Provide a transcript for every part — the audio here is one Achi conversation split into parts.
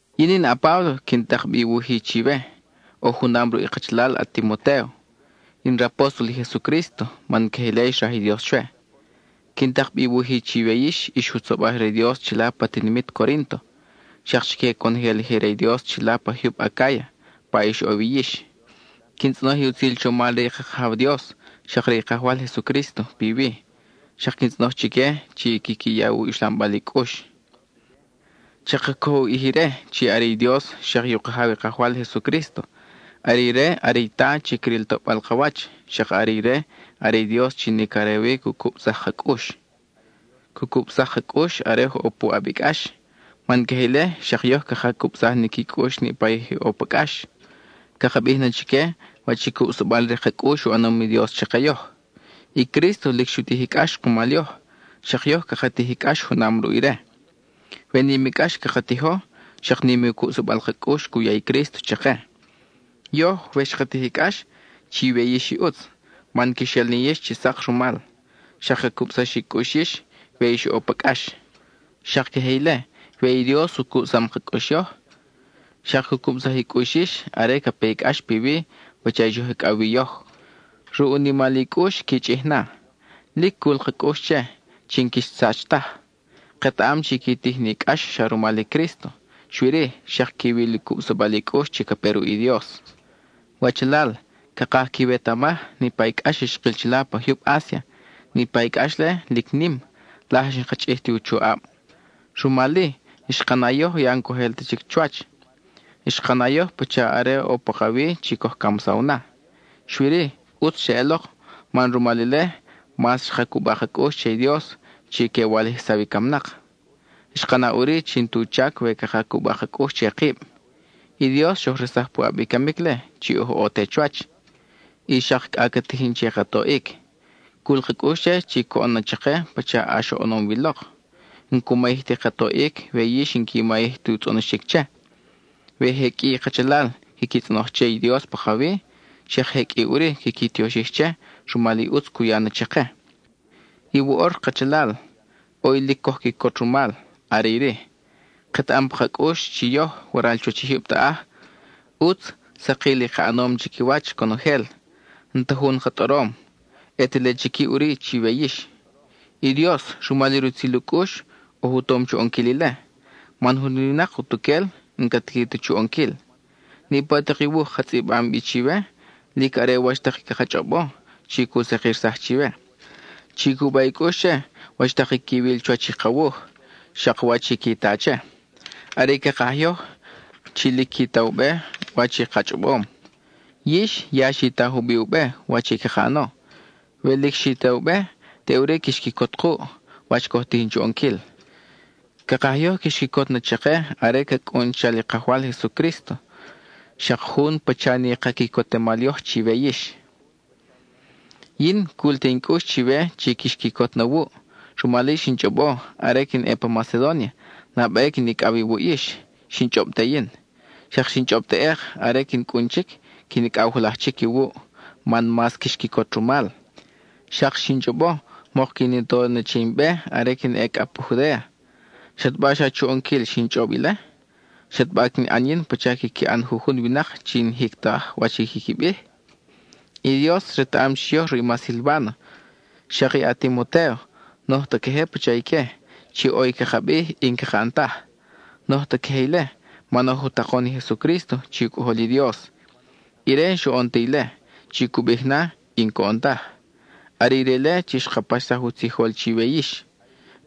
Yin in a-Páblo chi quin tak bi i wuj-i chiwe, oj junam ruʼ i kachalal a-Timotéo. In rapóstol i Jesucrísto man queje ile xraj i Dios chwe. Quin tak bi i wuj-i chiwe yix, ix jutzobaj re i Dios chila pa tinimit Corínto, xak chique conojel i je re i Dios chila pa jyub Acáya pa ix ʼo wi yix. Quin tzʼonoj i utzil chomal re i ka Kajaw Dios, xak i re i Kajwal Jesucrísto piwi; xak quin tzʼonoj chique chi quiqui ya i uxlambal i cʼux. Chaka cojo u ʼij ire chi are i u Dios xak i u Kajaw i Kajwal Jesucrísto; are ire are i Ta chi cril toʼbal ka wach; xak are ire are i Dios chi nic are wi cu cubsaj ka cʼux. Cu cubsaj ka cʼux are oj ʼo puʼab i cʼax, man queje ile xak yoj caka cubsaj ni qui cʼux niʼpa i je ʼo pa cʼax. Caka bij na chique wach i cubsabal re ka cʼux u ʼanom i Dios chake yoj. (I Crísto lic xu tij i cʼax kumal yoj, xak yoj caka tij i cʼax junam ruʼ ire.) We nim i cʼax caka tijo, xak nim u cubsabal ka cʼux cu ya i Crísto chake. Yoj, we xka tij i cʼax, chiwe yix i ʼutz, man quix el ni yix chi sak rumal, xak ca cubsax i cʼux yix we ix ʼo pa cʼax. Xak queje ile, we i Dios u cubsam ka cʼux yoj, xak cu cubsaj i cʼux yix are ca pe i cʼax piwi pacha i xoj icʼaw wi yoj; ruʼ u nimal i cʼux qui chʼij na. Lic cul ka cʼux che, chi n-quix sach taj. Ketaʼam chi qui tij ni cʼax xa rumal i Crísto, xui-ri, xak quiwil u cubsabal i cʼux chi ca pe ruʼ i Dios. Wachalal, cakaj quiwetamaj niʼpa i cʼax xkil chila pa jyub Asia. Niʼpa i cʼax-le, lic nim; laj n-xka chʼij ti u choʼab, rumal-i, xka na yoj ya n-coj el ta chic chuwach. Xka na yoj pacha are ʼo pakawi chi coj camsaw na, xui-ri, ʼutz xeʼelok man rumal ile mas xka cuba ka cʼux che i Dios chi que walijsaw i camnak. Xka na ʼuri chi n-tu chac we caka cuba ka cʼux che kib. I Dios xoj resaj puʼab i camic-le chi oj ʼo te chuwach; y xak cʼa ca tijin che ka toʼic. Cul ka cʼux che chi coʼon na chake pacha ʼax oʼonom wi lok. N-cu mayij ti ka toʼic we yix n-qui mayij ti u tzʼonoxic che. We je qʼui i kachalal quiqui tzʼonoj che i Dios pakawi, xak je qʼui ʼuri quiqui tioxij che rumal i ʼutz cu ya na chake. Y woʼor, kachalal, ʼo i lic coj quicot rumal; are iri: ketaʼam pa ka cʼux chi yoj, waral chuwach i jyub taʼaj, ʼutz sakil i ka ʼanom chiquiwach conojel; n-ta jun ka tʼorom, ʼe te le chic ʼuri chiwe yix. I Dios, rumal i rutzil u cʼux, oj u tom chu ʼonquil ile, man jun winak utuquel n-ca tiqui ta chu ʼonquil. Niʼpa tak i wuj ka tzʼibam bi chiwe, lic are wach tak i caka chʼobo chi cu sakirsaj chiwe. Chi cuba i cʼux che, wach tak i quiwil chuwach i ka wuj, xak wach i qui ta che. Are i cakaj yoj, chi lic qui ta u be wach i ka chʼobom. Yix ya xi ta jubiʼ u be, wach i caka ʼano. We lic xi ta u be, teʼuri quix quicot kuʼ, wach coj tijin chu ʼonquil. Cakaj yoj quix quicot na chake are ca cʼun chal i Kajwal Jesucrísto, xak jun pacha ni ka quicotemal yoj chiwe yix. Yin, cul te in cʼux chiwe chi quix quicot na wuʼ; rumal-i xin chʼobo, are quin ʼe pa Macedónia, nabe quin icʼaw iwuʼ yix, xin chʼob te yin. Xak xin chʼob teʼek, are quin cʼun chic, quin icʼaw julaj chic iwuʼ man mas quix quicot rumal. Xak xin chʼobo mok quin i to che in be are quin ʼe cʼa pa Judéa. ¿Xataba xa chu ʼonquil xin chʼob ile? ¿Xataba quin ʼan yin pacha quiqui ʼan jujun winak chi n-jic taj wach i quiqui bij? I Dios retaʼam chi yoj ruʼ i ma Silváno, xak i a-Timotéo n-oj ta queje pacha ique, chi ʼo i caka bij y n-caka ʼan taj. N-oj ta queje ile, man oj u takon i Jesucrísto, chi u Cʼojol i Dios. Ire n-xoʼon ta ile, chi cu bij na, y n-coʼon taj, y are ire-le chi xka paxsaj u tzijol chiwe yix.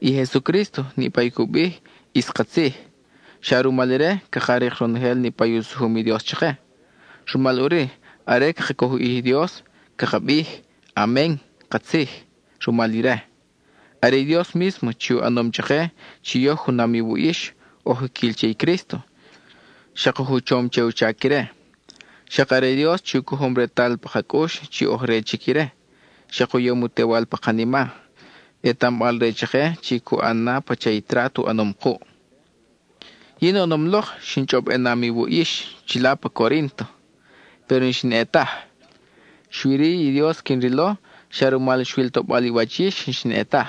I Jesucrísto, niʼpa i cu bij, ʼis katzij. Xa rumal ire, caka rik ronojel niʼpa u sujum i Dios chake. Rumal ʼuri, are caka coj u ʼij i Dios, caka bij “Amen (katzij)” rumal ire. Are i Dios mísmo chi u ʼanom chake, chi yoj junam iwuʼ yix, oj jiquil che i Crísto; xak oj u chom che u chac ire. Xak are i Dios chi u cojom retal pa ka cʼux chi oj re chic ire, xak u yom u Tewal pa kanima, ʼetambal-re chake chi cu ʼan na pacha i trat u ʼanom kuʼ. Yin oʼonom lok xin chʼob ʼenam iwuʼ chila pa Corínto, péro n-xin ʼe taj. Xui-ri, i Dios quin rilo, xa rumal xwil toʼbal i wach yix n-xin ʼe taj;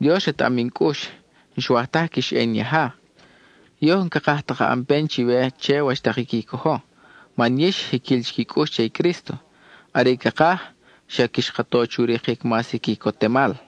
Dios retaʼam in cʼux, n-xwaj taj quix ʼe in yaja. Yoj n-cakaj ta caka ʼan pen chiwe che wach tak i qui cojo, man yix, jiquil chic i cʼux che i Crísto. Are i cakaj, xa quix ka to chu rikic mas i quicotemal.